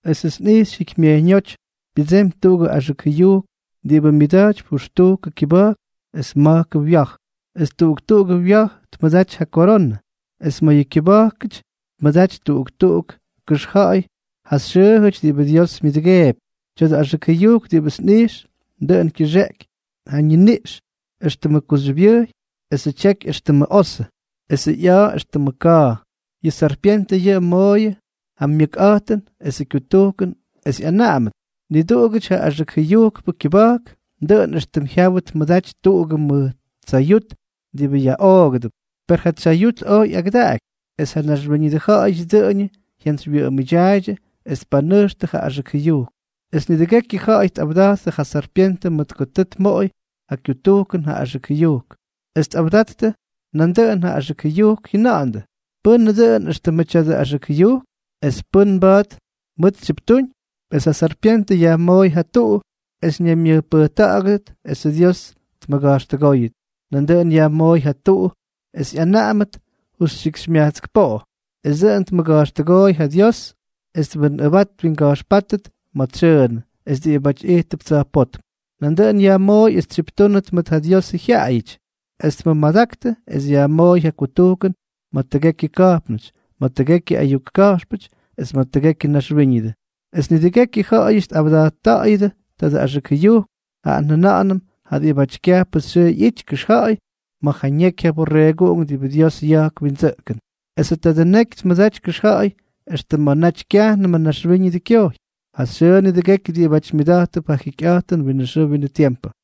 Esʉts nꞌijxy jikymyejyñóty pyʉdsemy tuꞌugʉ axʉk jʉyujk diꞌibʉ myʉda̱jtypy jʉxtujkʉ kyʉba̱jk es ma̱jkʉ wya̱j. Es tuꞌuk tuꞌugʉ wya̱j tmʉdaty ja koronʉ. Es ma̱ yʉ kyʉba̱jkʉty tmʉdaty tuꞌuk tuꞌuk kʉxja̱ꞌa̱y ja xyʉʉjʉty diꞌibʉ Dios myʉdʉgeepy. Tya̱dʉ axʉk jʉyujk diꞌibʉts nꞌijx, dʉꞌʉn kyʉxeꞌky ja ñiniꞌx éxtʉmʉ kuxyʉbyʉjy, esʉ tyeky éxtʉmʉ osʉ, esʉ ꞌya̱a̱ éxtʉmʉ ka̱a̱. Yʉ sarpyentʉ yʉꞌʉ mooyʉ ja myʉkꞌa̱jtʉn esʉ kyutujkʉn es ꞌyanaꞌamʉt. Niduꞌugʉty ja axʉk jʉyujkʉ kyʉba̱jk, dʉꞌʉn éxtʉm jyawʉ tmʉda̱jty tuꞌugʉ mʉj tsayut diꞌibʉ yaꞌoogʉdʉp. Per ja tsyayut oj ꞌyagʉdaꞌaky. Es ja naxwíñʉdʉ ja̱ꞌa̱yʉty dʉꞌʉñʉ jyantsywyʉꞌʉmʉdyaaydyʉ es tpanʉjxtʉ ja axʉk jʉyujk. Es nidʉgekyʉ ja̱ꞌa̱y tꞌawda̱jttʉ ja sarpyentʉ mʉt ko tʉ tmoꞌoy ja kyutujkʉn ja axʉk jʉyujk. Es tꞌawda̱jttʉ nandʉꞌʉn ja axʉk jʉyujk, jyʉna̱ꞌa̱ndʉ: —¿Pʉ́nʉ dʉꞌʉn éxtʉmʉ tya̱dʉ axʉk jʉyujk?, ¿es pʉ́nʉ mba̱a̱t mʉʉt tsyiptúñ? Es ja sarpyentʉ yajmooy ja tuꞌu es ñaymyʉjpʉjta̱ꞌa̱gʉdʉt esʉ Dios tmʉga̱jxtʉgóyʉt. Nandʉꞌʉn yajmooy ja tuꞌu es ꞌyanaꞌamʉt justyikxymyajtsk poꞌo. Es dʉꞌʉn tmʉga̱jxtʉgooy ja Dios es twinꞌʉbat twinga̱jxpátʉ ma̱ tsyʉʉnʉ es diꞌibáty ijttʉp tsa̱jpótm. Nandʉꞌʉn yajmooy es tsyiptúnʉt mʉt ja Diosʉ jyaꞌayʉty, extʉ tmʉmadaktʉ, es yajmooy ja kutujkʉn ma̱ tʉgekyʉ ka̱jpnʉty, ma̱ tʉgekyʉ ayuk ka̱jxpʉty, es ma̱ tʉgekyʉ naxwíñʉdʉ. Es nidʉgekyʉ ja̱ꞌa̱yʉty tꞌawda̱jtta̱ꞌa̱yʉdʉ tadʉ axʉk jʉyujk, jaꞌa njʉna̱ꞌa̱nʉm ja diꞌibáty kyajpʉ xyʉʉ ꞌyity kʉxja̱ꞌa̱y ma̱ ja ñeky ja Borreeguꞌunk diꞌibʉ Dios ya̱jk windsʉꞌkʉn. Esʉ tadʉ neky tmʉdaty kʉxja̱ꞌa̱y extʉ ma̱ naty kyajnʉmʉ naxwíñʉdʉ kyojy, ja xyʉʉ nidʉgekyʉ diꞌibáty myʉda̱jttʉp ja jikyꞌa̱jtʉn winʉ xʉʉ winʉ tiempʉ.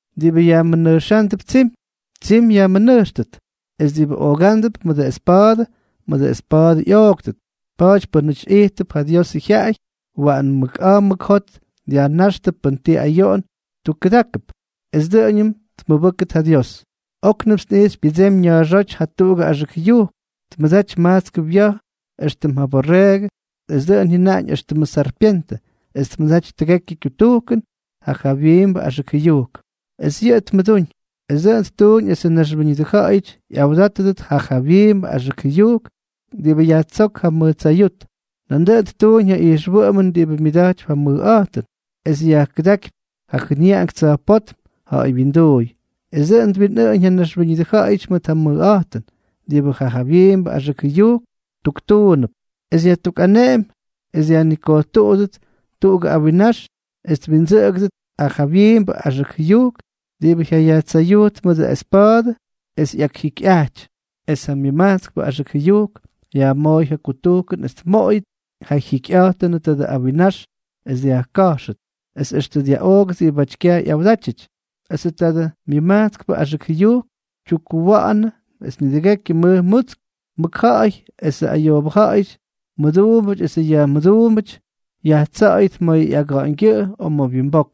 Diꞌibʉ yajmʉnʉjxándʉp tsimy, tsimy yajmʉnʉjxtʉt, es diꞌibʉ oogándʉp mʉdʉ espa̱a̱dʉ, mʉdʉ espa̱a̱dʉ ꞌyooktʉt. Pa̱a̱ty pʉ́nʉty ijttʉp ja Diosʉ jyaꞌay, waꞌan mʉk a̱a̱ mʉk jot dyajnáxtʉ pʉn ti ayoꞌon tukkʉdákʉp, es dʉꞌʉñʉm tmʉbʉ́ktʉt ja Dios. Oknʉmts nꞌijxy pyʉdsemy na̱a̱xóty jatuꞌugʉ axʉk jʉyujk, tmʉdaty majtskʉ wya̱j éxtʉm ja borreegʉ, es dʉꞌʉn jyʉnaꞌañ éxtʉmʉ sarpyentʉ, es tmʉdaty tʉgekyʉ kyutujkʉn ja jawyiimbʉ axʉk jʉyujk, es yʉꞌʉ tmʉdúñ. Es dʉꞌʉn ttuñ esʉ naxwíñʉdʉ ja̱ꞌa̱yʉty ꞌyawdátʉdʉt ja jawyiimbʉ axʉk jʉyujk diꞌibʉ yajtsók ja mʉj tsayut. Nandʉꞌʉn ttuuñ ja ijxwʉꞌʉmʉn diꞌibʉ myʉda̱jtypy ja mʉjꞌa̱jtʉn, extʉ yajkʉdákypy ja jʉnyaꞌank tsa̱jpótm ja̱ꞌa̱y wyinduuy, es dʉꞌʉn twinꞌʉʉñ ja naxwíñʉdʉ ja̱ꞌa̱yʉty mʉt ja mʉjꞌa̱jtʉn diꞌibʉ ja jawyiimbʉ axʉk jʉyujk tuktuunʉp. Es yajtukꞌaneꞌemy es dyajnikojtuꞌuttʉt tuꞌugʉ awinnax es twindsʉꞌʉgʉdʉt ja jawyiimbʉ axʉk jʉyujk diꞌibʉ jyayajtsayujt mʉdʉ espa̱a̱dʉ es ꞌyakjikyꞌajty. Es ja myʉmajtskpʉ axʉk jʉyujk yajmooy ja kutujkʉn es tmoꞌoyʉt ja jyikyꞌa̱jtʉnʉ tadʉ awinnax es dyajka̱jxʉt, es extʉ dyaꞌoogʉt diꞌibáty kyaj ꞌyawdátyʉty. Esʉ tadʉ myʉmajtskpʉ axʉk jʉyujk tyukkuwa̱ꞌa̱nʉ es nidʉgekyʉ mʉj mutsk, mʉkja̱ꞌa̱y esʉ ayoobʉ ja̱ꞌa̱yʉty, mʉduumbʉty esʉ yajmʉduumbʉty, yajtsa̱ꞌa̱yʉt ma̱ ꞌyaga̱ꞌa̱ñgyʉꞌʉ o ma̱ wyimbok.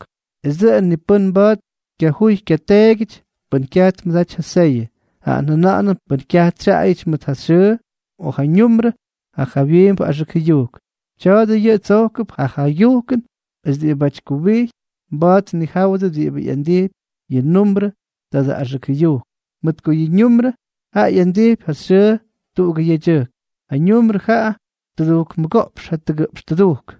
Es dʉꞌʉn ni pʉ́n mba̱a̱t kyajuy kyateegyʉty pʉn kyaj tmʉdaty ja seyʉ, jaꞌa njʉna̱ꞌa̱nʉm pʉn kyaj tsyaꞌayʉty mʉt ja xyʉʉ o ja ñumbrʉ ja jawyiimbʉ axʉk jʉyujk. Tya̱a̱dʉ yʉꞌʉ tsojkʉp ja jaygyujkʉn. Es diꞌibáty kuwijy mba̱a̱t tnijáwʉdʉ diꞌibʉ ꞌyandijpy yʉ ñumbrʉ tadʉ axʉk jʉyujk, mʉt ko yʉ ñumbrʉ jaꞌa ꞌyandijpy ja xyʉʉ tuꞌugʉ yedyʉjk. Yʉ ñumbrʉ jaꞌa tʉdujk mʉgoꞌpx jatʉgʉꞌpx tʉdujk.